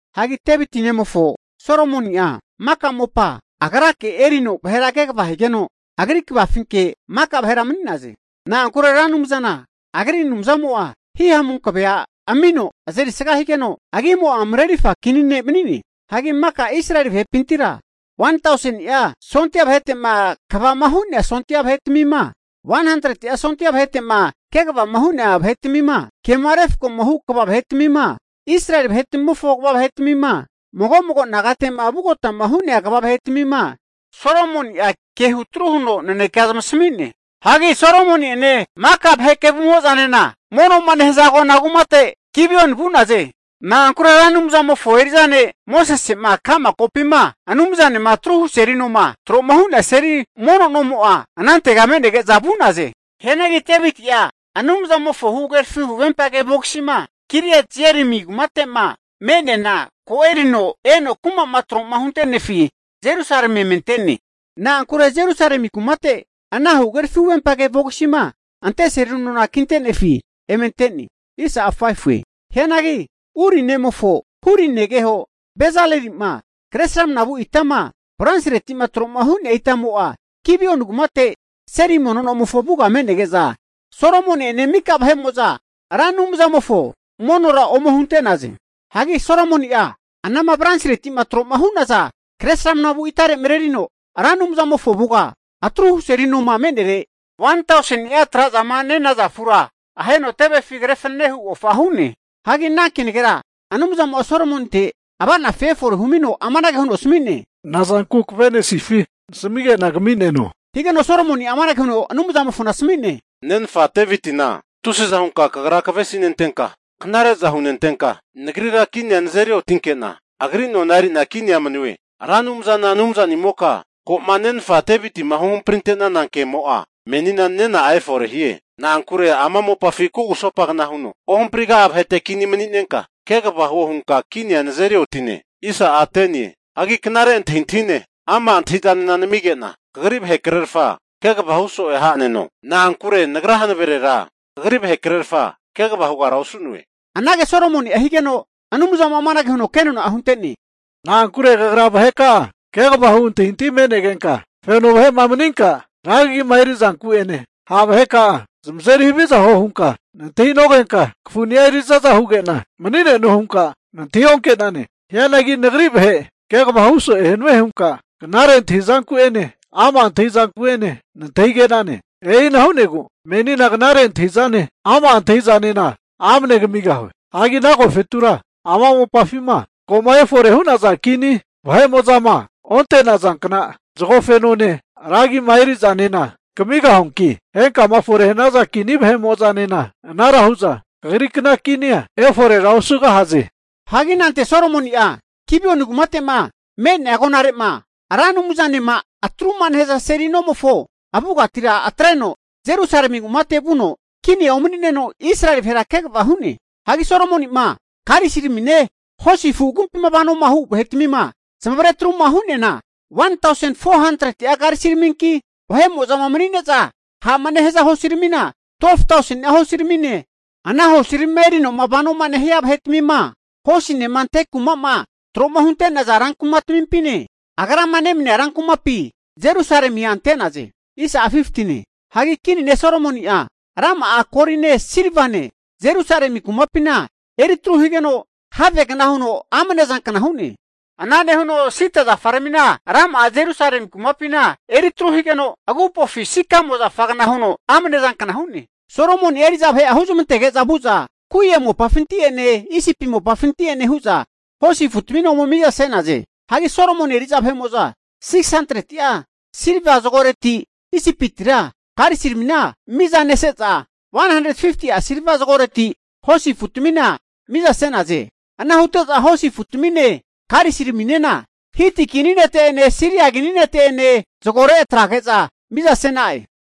Hagi Deviti nemofo, Solomoni'a maka mopa agrake erino vahera kegava higeno, agri kvafinke maka vahera mani'naze. Na'ankure Ra Anumzana agri Anumzamo'a hihamu hankavea amino, azerisga higeno agimo'a marerirfa kini ne' mani'ne. Hagi maka Israeli vahepintira, 1tauseni'a sondia vahetema kvama hu'nea sondia vahetmima, 100'a sondia vahete'ma kegavama hu'nea vahetmima, kema refkoma hu kva vahetmima, Israeli vahetmimofo kva vahetmima, mago mago nagate'ma vugotama hu'nea kva vahetmima huno Solomoni'a ke hutru huteno nanekea zamasami'ne. Hagi ana huteno Solomoni'ene maka vahe kevumo'zanena mono'ma nehaza agona kumate Gibioni vu'naze. Na'ankure Ra Anumzamofo eri'za ne' Mosese'ma ka'ma kopima Anumzanema atruhu seli noma tro'ma hu'nea seli mono nomo'a anantega me'nege'za vu'naze. Hianagi Deviti'a Anumzamofo huhagerafi huvempage vogisima Kiriat-Jearimi kumate'ma me'neana ko erino eno kuma'ma tro'ma hunte'nefi Jerusalemi eme ante'ne. Na'ankure Jerusalemi kumate ana huhagerafi huvempage vogisima ante seli nona kinte'nefi eme ante'ne. Hianagi Uri nemofo, Huri negeho Bezaleli'ma kre sramana vu itama bronsiretima tro'ma hu'nea itamo'a Gibioni kumate seli mono nomofo avuga me'nege'za, Solomoni'ene maka vahe'mo'za Ra Anumzamofo vahe'mo'za monora ome hunte'naze. Hagi Solomoni'a ana bronsire kre sramnavu itare marerino Ra Anumzamofo avuga atruhu seli noma me'nere, 1tauseni'a tra'zama nenaza afura aheno tevefi kre fananehu ofa hu'ne. Hagi ana kenagera Anumzamo'a Solomoninte ava'nafi efore huno amanage huno asami'ne, nazanku kavenesifi nasamige'na kami'neno, higeno Solomoni'a amanage huno Anumzamofona asami'ne, nenfa Devitina tusiza hunka Kagra kavesintenka knare'za hunentenka, nagrira kinia nazeri otinke'na, agri nona eri'na kinia manue. Ra Anumzana Anumzanimoka, ko'ma nenfa Devitima huhamprinte'nana kemo'a menina nena'a efore hie. Na'ankure ama mopafi kugusopagna huno ohompriga'a vahete kinia mani'nenka kegava huo hunka kinia nazeri otine. Hagi knare antahintahine, ama' antahi'zanena namige'na, kagri vahekrerfa kegavahu so'e ha'neno. Na'ankure nagra hanaverera kagri vahekrerfa kegava hugara osu'noe. Anage Solomoni'a higeno, Anumzamo'a amanage huno kenona'a hunte'ne, na'ankure kagra vaheka'a kegava hu antahintahi me'negenka, feno vahe'ma maninka ra kagima eri'zanku'ene, ha' vaheka'a zamazeri haviza huo hunka nantahinogenka, kafuni'a eri'zaza huge'na mani'neno hunka nantahi onke'nane. Hianagi nagri vahe kegava hu so'e hanue hunka knare antahizanku'ene ama' antahi'zanku'ene nantahige'nane. E'ina hu'negu menina knare antahintahi'zane, ama' antahi'zanena amne kamigahue. Hagi ana agofetura ama mopafima ko'ma efore'ma hu'naza kini vahe'mo'zama onte'nazankna zagofenone, ragima eri'zanena kamigahuanki, henkama fore'ma hanaza kini vahe'mo'zanena, anara hu'za kagrikna kinia eforera osugahaze. Hagi anante Solomoni'a Gibeoni kumate'ma me'nea agonarema Ra Anumzanema atruma nehaza seli nomofo avugatira atreno, Jerusalemi kumate vuno kinia umani'neno, Israeli vahera kegava hu'ne. Hagi Solomoni'ma karisiramine hosi afu agumpima vanoma hu vahetmima zamavare atruma hu'neana, 1tausen 400'a karisiraminki, vahe'mo'zama mani'ne'za ha'ma nehaza hosiramina 12tauseni'a hosiramine, ana hosirami erinoma vanoma nehia vahetamine, hosinema nente'za manisaza kumama tro'ma hunte'naza ran kumatmimpine, agrama nemania ran kumapi Jerusalemia ante'naze. Hagi kini ne' Solomoni'a rama'a goline silvane Jerusalemi kumapina eritru higeno, havegna huno amne zankna hu'ne. Ana nehuno sida zafaramina rama'a Jerusalemi kumapina eri tru higeno, agupofi sikamo zafagna huno amne zankna hu'ne. Solomoni'a eri'za vahe'a huzmantege'za vu'za Kue mopafinti'ene Isipi mopafinti'ene hu'za hosi afutamina ome mizase'naze. Hagi Solomoni eri'za vahe'mo'za 600'a silva zagoreti Isipitira karisiramina mizanese'za, 150'a silva zagoreti hosi afutamina mizase'naze. Ana hute'za hosi afutamine karisiraminena Hiti kini vahete'ene, Siria kini vahete'ene zagore atrege'za mizase'naze.